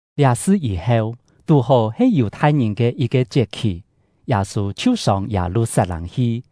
Liá sṳ yî-heu, tú-hó he Yù-thai-ngìn ke yit-ke chiet-khì, Yâ-sû chhiu sông Yâ-lu-sat-lâng hi.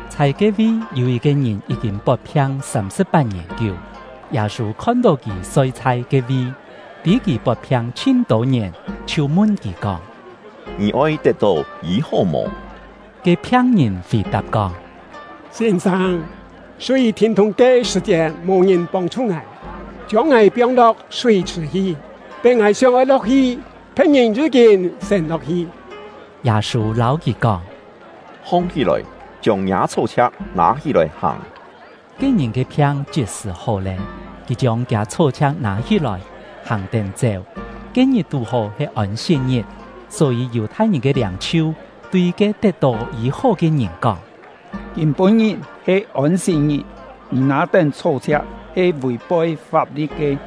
Chhai ke-vi yû yit-ke ngìn yí-kîn pot-phiang sâm-sṳ̍p-pat-ngièn kiú. Yâ-sû khon-tó kì soi chhai ke-vi, tî kì pot-phiang chhin-tô ngièn, chhiu mun kì kóng: “Ngì oi tet-tó yî-hó mò?” Ke phiang-ngìn fì-tap kóng: “Sîn-sâng, súi thîn-thûng ke sṳ̀-chiet mò ngìn pông-chhu ngài, chiông ngài piong-lo̍k súi-chhṳ̀ hi; tén ngài sióng-oi lo̍k-hi, phe̍t-ngìn yí-kîn siên lo̍k-hi.” Yâ-sû lâu kì kóng: “Hong-hí-lòi, chiông ngiâ chhó-chhia̍k nâ-hí-lòi hàng!” Ke ngìn ke phiang chit-sṳ̀ hó lé, kì chiông kiâ chhó-chhia̍k nâ-hí-lòi, hàng-tén chéu. Ke-ngit tú-hó he Ôn-sit-ngit, só-yî Yù-thai-ngìn ke liâng-chhiu tui ke tet-tó yî-hó ke ngìn kóng: “Kîm-pû-ngit he Ôn-sit-ngit, ngì nâ-tén chhó-chhia̍k he vì-poi fap-li̍t ke.”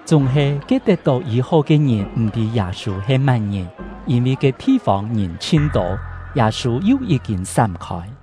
Chúng-he ke tet-tó yî-hó ke ngìn m̀-tî Yâ-sû he má-ngìn; yîn-vi ke thi-fông ngìn chhin-tô, Yâ-sû yu yí-kîn sám-khôi.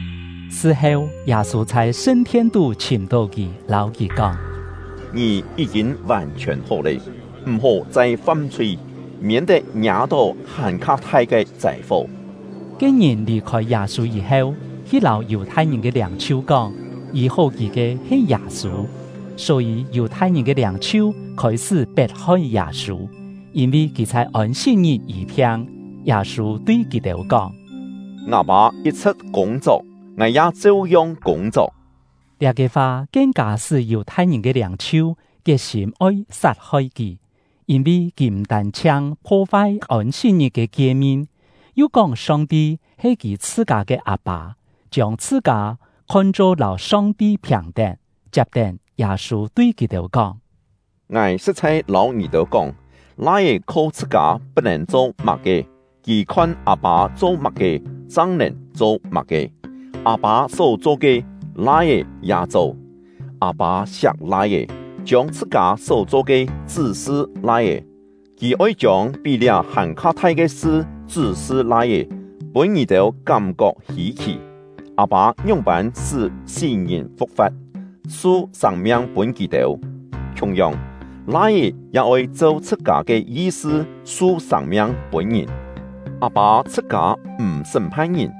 Sṳ heu, Yâ-sû chhai sṳn-thien-tú chhìm-tó kì, lâu kì kóng: “Ngì yí-kîn vàn-chhiòn hó lé, m̀-hó chai fam-chhui, miên-tet ngiâ-tó hàn-kha thai ke châi-fo.” Ke ngìn lì-khôi Yâ-sû yî-heu, hi lâu Yù-thai-ngìn ke liâng-chhiu kóng, yî-hó kì ke he Yâ-sû. Só-yî Yù-thai-ngìn ke liâng-chhiu khôi-sṳ́ pet-hoi Yâ-sû, yîn-vi kì chhai Ôn-sit-ngit yî-phiang. Yâ-sû tui kì-têu kóng: “Ngâ Pâ yit-chhṳ̍t kûng-chok, ngài ya cheu-yong kûng-chok.” Liá-ke fa kien-kâ sṳ́ Yù-thai-ngìn ke liâng-chhiu kiet-sîm oi sat-hoi kì; yîn-vi kì m̀ tân-chhiang pho-fai Ôn-sit-ngit ke kie-min, yu kóng Song-ti he kì chhṳ-kâ ke Â-pâ, chiông chhṳ-kâ khon-cho lâu Song-ti phìn-tén. Chiap-tén, Yâ-sû tui kì-têu kóng: “Ngài sṳ̍t-chhai lâu ngì-têu kóng, Lai-é kho chhṳ-kâ put-nèn cho má-ke; kì khon Â-pâ cho má-ke, chang nèn cho má-ke. Â-pâ só cho ke, Lai-é ya cho. Â-pâ siak Lai-é, chiông chhṳ-kâ só-cho ke chṳ́-sṳ Lai-é. Kì oi chiông pí liá hàn-kha thai ke sṳ chṳ́-sṳ Lai-é, pûn ngì-têu kám-kok hî-khì. Â-pâ ngióng-pân sṳ́ sí-ngìn fu̍k-fa̍t, su sâng-miang pûn kì-têu; khiung-yong, Lai-é ya oi cheu chhṳ-kâ ke yi-sṳ su sâng-miang pûn ngìn. Â-pâ chhṳ-kâ m̀ sṳ́m-phan ngìn;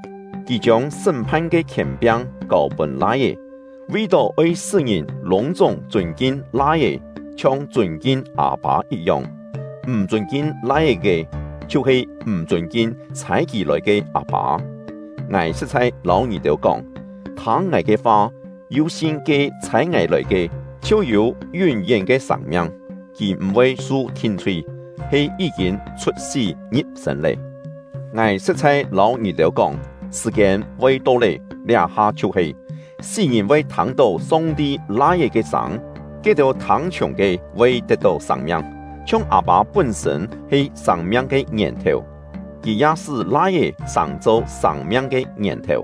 Kì chiông sṳ́m-phan ke khièn-piang kâu-pûn Lai-é, vi-tó oi sṳ́ ngìn lûng-chúng chûn-kin Lai-é, chhiong chûn-kin Â-pâ yit-yong. M̀ chûn-kin Lai-é ke, chhiu-he m̀ chûn-kin chhâi kì lòi ke Â-pâ. “Ngài sṳ̍t-chhai lâu ngì-têu kóng, thâng ngài ke fa, yu sin ke ‘Chhâi ngài lòi ke’, chhiu yû yún-yén ke sâng-miang. Kì m̀-voi su thin-chhui, he yí-kîn chhut-sí ngi̍p-sên lé. Ngài sṳ̍t-chhai lâu ngì-têu kóng, sṳ̀-kiên voi to lé, liá-ha chhiu he, sí-ngìn voi thâng-tó Song-ti Lai-é ke sâng; ke-têu thâng-chhiùng ke, voi tet-tó sâng-miang. Chhiong Â-pâ pún-sṳ̂n he sâng-miang ke ngièn-thèu, Kì ya sṳ́ Lai-é sàng-cho sâng-miang ke ngièn-thèu.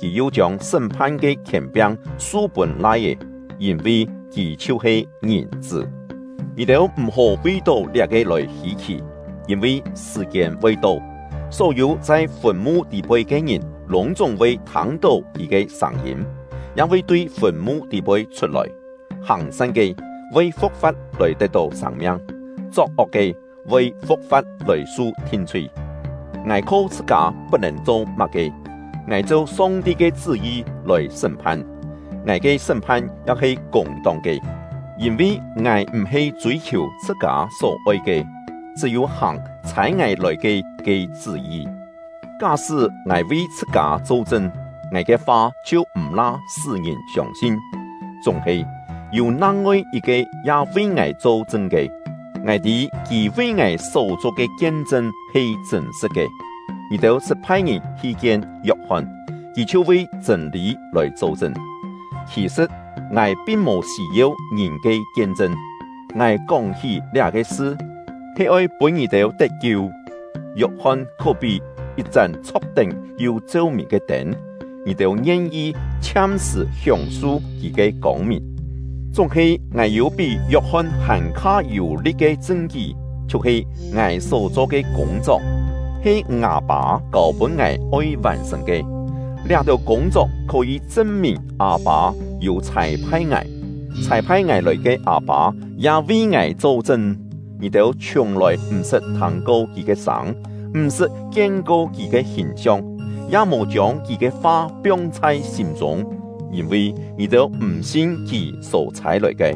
Kì yu chiông sṳ́m-phan ke khièn-piang su-pûn Lai-é, yîn-vi kì chhiu-he Ngìn-chṳ́. Ngì-têu m̀-hó vi-tó liá-ke lòi hî-khì; yîn-vi sṳ̀-kiên voi to, só-yû chhai fùn-mu tî-poi ke ngìn lûng-chúng voi thâng-tó kì ke sâng-yîm, ya voi tui fùn-mu tî-poi chhut-lòi: Hàng-san ke, voi fu̍k-fa̍t lòi tet-tó sâng-miang; chok-ok ke, voi fu̍k-fa̍t lòi su thin-chhui. “Ngài kho chhṳ-kâ put-nèn cho má-ke; ngài cheu Song-ti ke chṳ́-yi lòi sṳ́m-phan; ngài ke sṳ́m-phan ya he kûng-tong ke, yîn-vi ngài m̀-he chûi-khiù chhṳ-kâ só-oi ke, chṳ́-yû hàng ‘Chhâi ngài lòi ke’ ke chṳ́-yi. “Ká-sṳ́ ngài vi chhṳ-kâ cho-chṳn, ngài ke fa chhiu m̀-la sṳ́ ngìn siông-sin. Chúng-he, yû nang-ngoi yit-ke ya vi ngài cho-chṳn ke, ngài tî Kì vi ngài só-cho ke kien-chṳn he chṳ̂n-sṳ̍t ke. Ngì-têu sṳt phai-ngìn hi kien Yok-hon, kì chhiu vi chṳ̂n-lî lòi cho-chṳn. Khì-sṳ̍t, ngài pin mò sî-yeu ngìn ke kien-chṳn; ngài kóng-hí liá-ke sṳ, he oi pûn ngì-têu tet-kiu. Yok-hon khó-pí yit-chán chho̍k-tén yu cheu-mìn ke tên, ngì-têu ngien-yi chhiam-sṳ̀ hióng-su kì ke kông-mìn. Chúng-he ngài yû pí Yok-hon hàn-kha yû-li̍t ke chṳn-kí, chhiu-he ngài só-cho ke kûng-chok, he ngâ Pâ kâu-pûn ngài oi vàn-sṳ̀n ke. Liá-têu kûng-chok khó-yî chṳn-mìn Â-pâ yû chhâi-phai ngài. Chhâi-phai ngài lòi ke Â-pâ ya vi ngài cho-chṳn. Ngì-têu chhiùng-lòi m̀-sṳt thâng-ko Kì ke sâng, m̀-sṳt kien-ko Kì ke hìn-siong, ya mò chiông Kì ke fa piong chhai sîm-chûng, yîn-vi ngì-têu m̀ sin Kì só chhâi-lòi ke.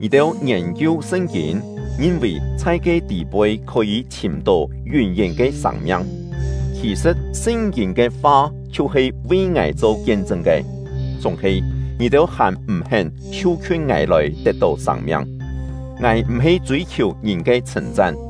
Ngì-têu ngiên-kiu Sṳn-kîn, ngin-vì chhai ke tî-poi khó-yî chhìm-tó yún-yén ke sâng-miang; khì-sṳ̍t Sṳn-kîn ke fa chhiu-he vi ngài cho kien-chṳn ke! Chúng-he, ngì-têu hàn m̀-hén chhiu-khiun ngài lòi tet-tó sâng-miang. “Ngài m̀-he chûi-khiù ngìn ke chhṳ̂n-chan.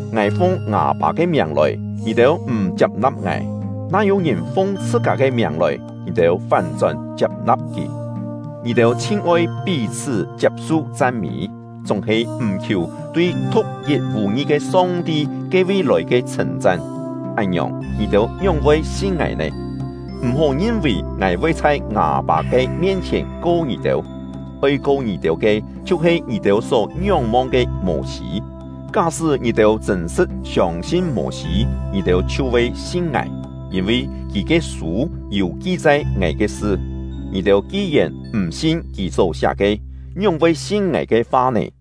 Ngài fung ngâ Pâ ke miàng lòi, ngì-têu m̀ chiap-na̍p ngài; na yû-ngìn fung chhṳ-kâ ke miàng lòi, ngì-têu fán-chón chiap-na̍p kì. Ngì-têu chhin-oi pí-chhṳ́ chiap-su chan-mî, chúng-he m̀ khiù tui thu̍k-yit vù-ngi ke Song-ti ke-vi lòi ke chhṳ̂n-chan; án-ngiòng, ngì-têu ngióng-voi sin ngài nè? M̀-hó ngin-vì ngài voi chhai ngâ Pâ ke mien-chhièn ko ngì-têu; oi ko ngì-têu ke chhiu-he ngì-têu só ngióng-mong ke Mô-sî. Ká-sṳ́ ngì-têu chṳ̂n-sṳ̍t siông-sin Mô-sî, ngì-têu chhiu voi sin ngài, yîn-vi kì ke sû yû ki-chai ngài ke sṳ. Ngì-têu ki-yèn m̀ sin kì só-siá ke, ngióng-voi sin ngài ke fa nè?”